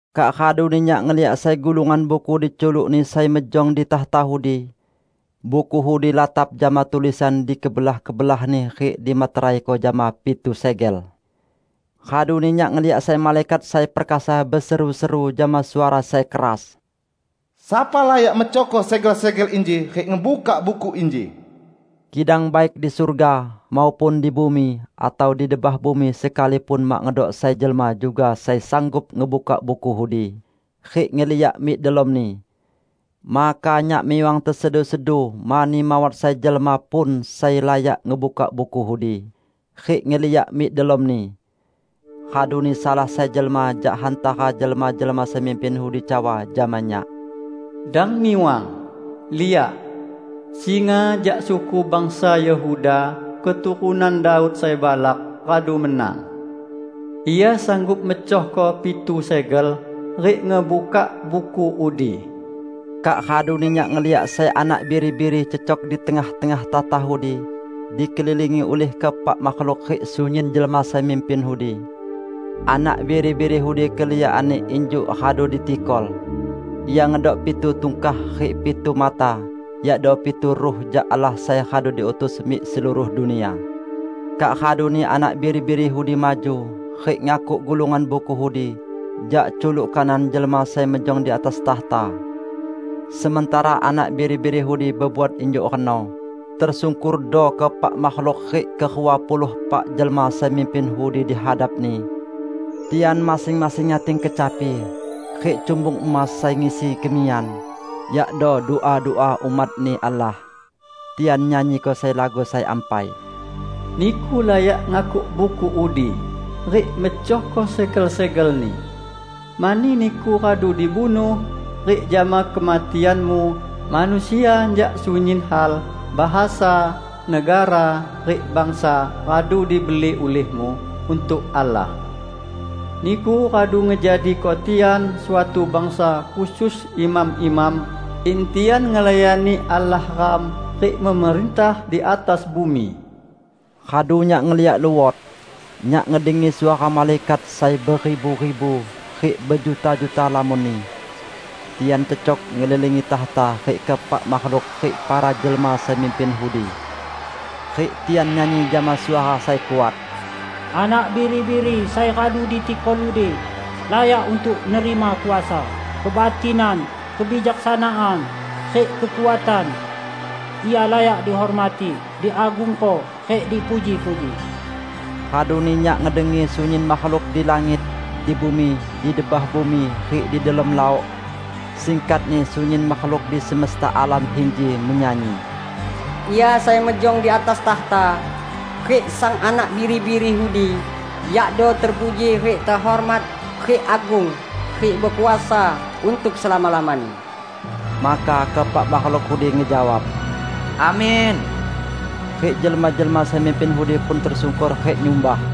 Kak raduni nyak ngeliak sai gulungan buku diculuk-Ni sai mejong di takhta udi. Buku udi latap jama tulisan di kebelah-kebelahni rik dimeteraiko jama pitu segel. Raduni nyak ngeliak sai malaikat sai perkasa beseru-seru jama suara sai keras, "Sapa layak mecohko segel-segel inji rik ngebukak buku inji?" Kidang baik di surga, maupun di bumi, atau di debah bumi sekalipun mak ngedok sai jelma juga sai sanggup ngebukak buku udi, rik ngeliak mik delomni. Maka nyak miwang tesedu-sedu mani mawat sai jelma pun sai layak ngebukak buku udi, rik ngeliak mik delomni. Raduni salah sai jelma jak hantara jelma-jelma sai mimpin udi cawa jama nyak, "Dang miwang! Liak! Singa jak suku bangsa Yehuda, keturunan Daud sai balak, radu menang. Ia sanggup mecohko pitu segel rik ngebukak buku udi." Kak raduni nyak ngeliak sai Anak Biri-biri cecok di tengah-tengah takhta udi, dikelilingi ulih keepak makhluk rik sunyin jelma sai mimpin udi. Anak Biri-biri udi keliakanni injuk radu ditikol. Ia ngedok pitu tungkah rik pitu mata: yakdo pitu ruh jak Allah sai radu diutus mik seluruh dunia. Kak raduni Anak Biri-biri udi maju rik ngakuk gulungan buku udi jak culuk kanan jelma sai mejong di atas takhta. Sementara Anak Biri-biri udi bebuat injuk reno, tersungkordo keepak makhluk rik kerua puluh epak jelma sai mimpin udi di hadap-Ni. Tian masing-masing nyating kecapi rik cumbung emas sai ngisi kemiyan, yakdo dua-dua umat-Ni Allah. Tian nyanyiko sai lagu sai ampai: "Niku layak ngakuk buku udi rik mecohko segel-segelni. Mani Niku radu dibunuh, rik jama kematian-Mu, manusia jak sunyin hal, bahasa, negara rik bangsa radu dibeli ulihmu untuk Allah. Niku radu ngejadiko tian suatu bangsa khusus imam-imam, in tian ngelayani Allah ram, rik memerintah di atas bumi." Radu nyak ngeliak luot. Nyak ngedengi suara malaikat sai beribu-ribu rik bejuta-juta lamonni. Tian cecok ngelilingi takhta rik keepak makhluk rik para jelma sai mimpin udi. Rik tian nyanyi jama suara sai kuat, "Anak Biri-biri sai radu ditikol udi, layak untuk nerima kuasa, kebatinan, kebijaksanaan rik kekuatan; Ia layak dihormati, diagungko rik dipuji-puji!" Raduni nyak ngedengi sunyin makhluk di langit, di bumi, di debah bumi rik di delom laok -- singkatni sunyin makhluk di semesta alam inji -- menyanyi, "Ia sai mejong di atas takhta, rik Sang Anak Biri-biri udi, yakdo terpuji rik tehormat rik agung rik bekuasa untuk selama-lamani!" Maka keepak makhluk udi ngejawab, "Amin!" Rik jelma-jelma sai mimpin udi pun tesungkor rik nyumbah.